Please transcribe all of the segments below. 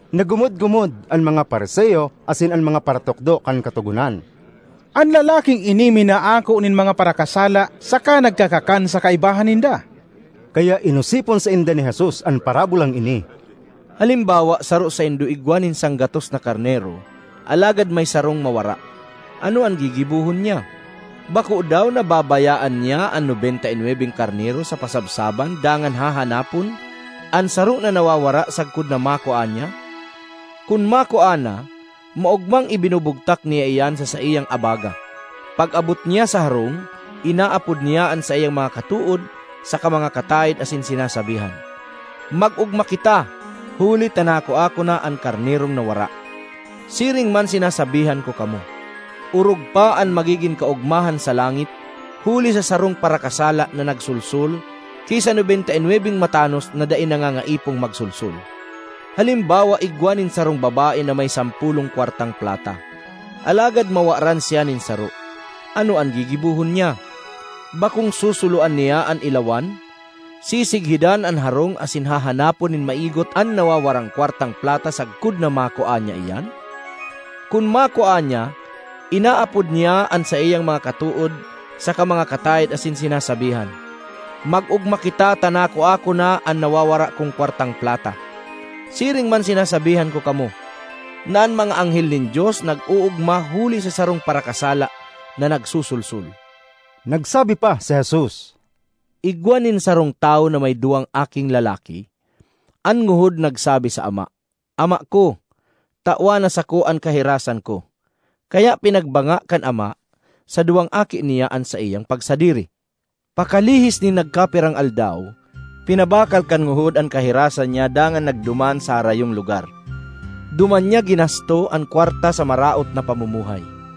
Naggumod-gumod an mga Fariseo asin an mga paratukdo kan Katogonan, “An lalaking ini minaako nin mga parakasala saka nagkakakan sa kaibahan ninda!” Kaya inosipon sainda ni Jesus an parabolang ini, ”Halimbawa saro saindo igwa nin sanggatos na karnero alagad may sarong mawara, ano an gigibohon niya? Bako daw na babayaan niya an nobenta y nwebeng karnero sa pasabsaban dangan hahanapon an saro na nawawara sagkod na makua niya? Kun makua na, maogmang ibinubugtak niya iyan sa saiyang abaga. Pag-abot niya sa harong, inaapod niya an saiyang mga katood saka mga kataed asin sinasabihan, ‘Mag-ogma kita, huli ta nakua ko na an karnerong nawara!’ Siring man sinasabihan ko kamo, orog pa an magigin kaogmahan sa langit huli sa sarong parakasala na nagsolsol, ki sa nobenta y nwebeng matanos na dai nangangaipong magsolsol. ”Halimbawa igwa nin sarong babae na may sampolong kwartang plata, alagad mawaran siya nin saro, ano an gigibohon niya? Bakong susuloan niya an ilawan, sisighidan an harong asin hahanapon nin maigot an nawawarang kwartang plata sagkod na makua niya iyan? Kun makua niya, inaapod niya an saiyang mga katood saka mga kataed asin sinasabihan, ‘Mag-ogma kita ta nakua ko na an nawawara kong kwartang plata!’ Siring man sinasabihan ko kamo, na an mga anghel nin Dios nag-oogma huli sa sarong parakasala na nagsosolsol.” Nagsabi pa si Jesus, “Igwa nin sarong tawo na may duwang aking lalaki. An ngohod nagsabi sa ama, ‘Ama ko, tawan na sako an kahirasan ko!’ Kaya pinagbanga kan ama sa duwang aki niya an saiyang pagsadiri. Pakalihis nin nagkapirang aldaw, ipinabakal kan ngohod an kahirasan niya dangan nagduman sa harayong lugar. Duman niya ginasto an kwarta sa maraot na pamumuhay.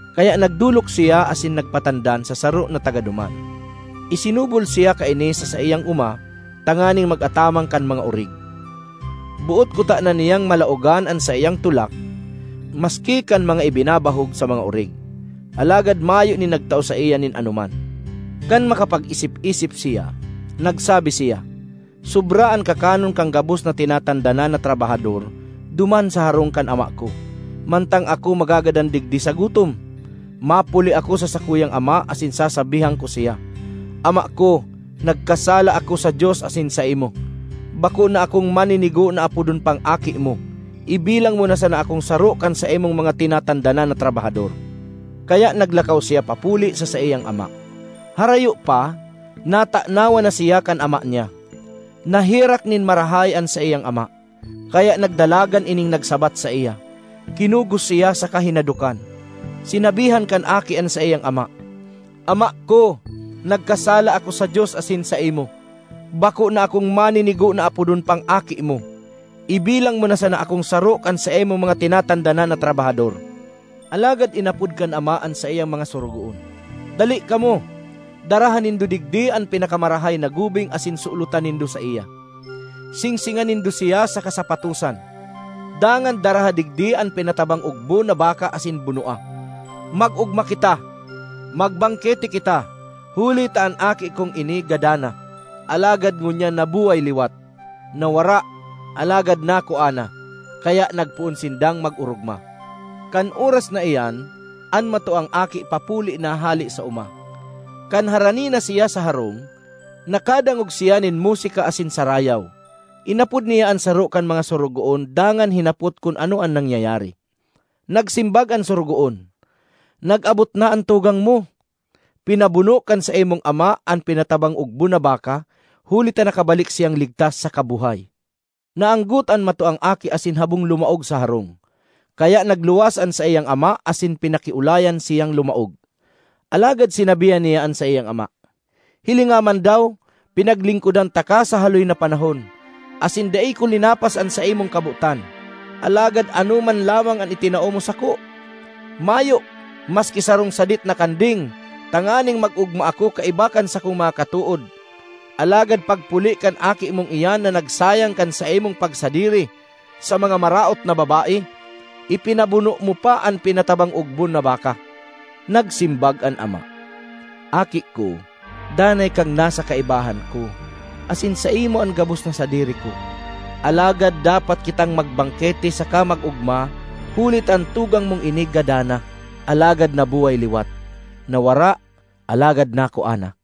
Kaya nagdolok siya asin nagpatandan sa saro na taga duman; isinubol siya kaini sa saiyang oma tanganing mag-ataman kan mga orig. Boot kutana niyang malaogan an saiyang tulak maski kan mga ibinabahog sa mga orig, alagad mayo nin nagtao saiya nin anoman. Kan makapag-isip-isip siya, nagsabi siya, ‘Sobra an kakanon kan gabos na tinatandanan na trabahador duman sa harong kan ama ko, mantang ako magagadan digdi sa gutom! Mapuli ako sa sakuyang ama asin sasabihan ko siya, “Ama ko, nagkasala ako sa Dios asin saimo. Bako na akong maninigo na apodon pang aki mo; ibilang mo na sana akong saro kan saimong mga tinatandanan na trabahador.”’ Kaya naglakaw siya papuli sa saiyang ama. “Harayo pa, natanawan na siya kan ama niya. Naherak nin marahay an saiyang ama, kaya nagdalagan ining nagsabat saiya, kinugos siya saka hinadokan. Sinabihan kan aki an saiyang ama, ‘Ama ko, nagkasala ako sa Dios asin saimo. Bako na akong maninigo na apodon pang aki mo. Ibilang mo na sana akong saro kan saimong mga tinatandanan na trabahador.’ Alagad inapod kan ama an saiyang mga sorogoon, ‘Dali kamo; daraha nindo digdi an pinakamarahay na gubing asin sulotan nindo saiya; singsingan nindo siya saka sapatosan. Dangan daraha digdi an pinatabang ogbon na baka asin bunoa! Mag-ogma kita! Magbangkete kita! Huli ta an aki kong ini gadan na, alagad ngunyan nabuhay liwat; nawara, alagad nakua na.’ Kaya nagpoon sindang mag-orogma. ”Kan oras na iyan, an matuang aki papuli na hale sa oma. Kan harani na siya sa harong, nakadangog siya nin musika asin sarayaw. Inapod niya an saro kan mga sorogoon dangan hinapot kun ano an nangyayari. Nagsimbag an sorogoon, ‘Nag-abot na an tugang mo! Pinabuno kan saimong ama an pinatabang ogbon na baka huli ta nakabalik siyang ligtas saka buhay.’ Naanggot an matuang aki asin habong lumaog sa harong; kaya nagluwas an saiyang ama asin pinakiolayan siyang lumaog. Alagad sinabihan niya an saiyang ama, ‘Hilinga man daw, pinaglingkodan taka sa haloy na panahon, asin dai ko linapas an saimong kabotan, alagad ano man lamang an itinao mo sako? Mayo, maski sarong sadit na kanding tanganing mag-ogma ako kaiba kan sakong mga katood! Alagad pagpuli kan aki mong iyan na nagsayang kan saimong pagsadiri sa mga maraot na babae, ipinabuno mo pa an pinatabang ogbon na baka!’ Nagsimbag an ama, ‘Aki ko, danay kang nasa kaibahan ko, asin saimo an gabos na sadiri ko. Alagad dapat kitang magbangkete saka mag-ogma huli ta an tugang mong ini gadan na, alagad nabuhay liwat; nawara, alagad nakua na.’”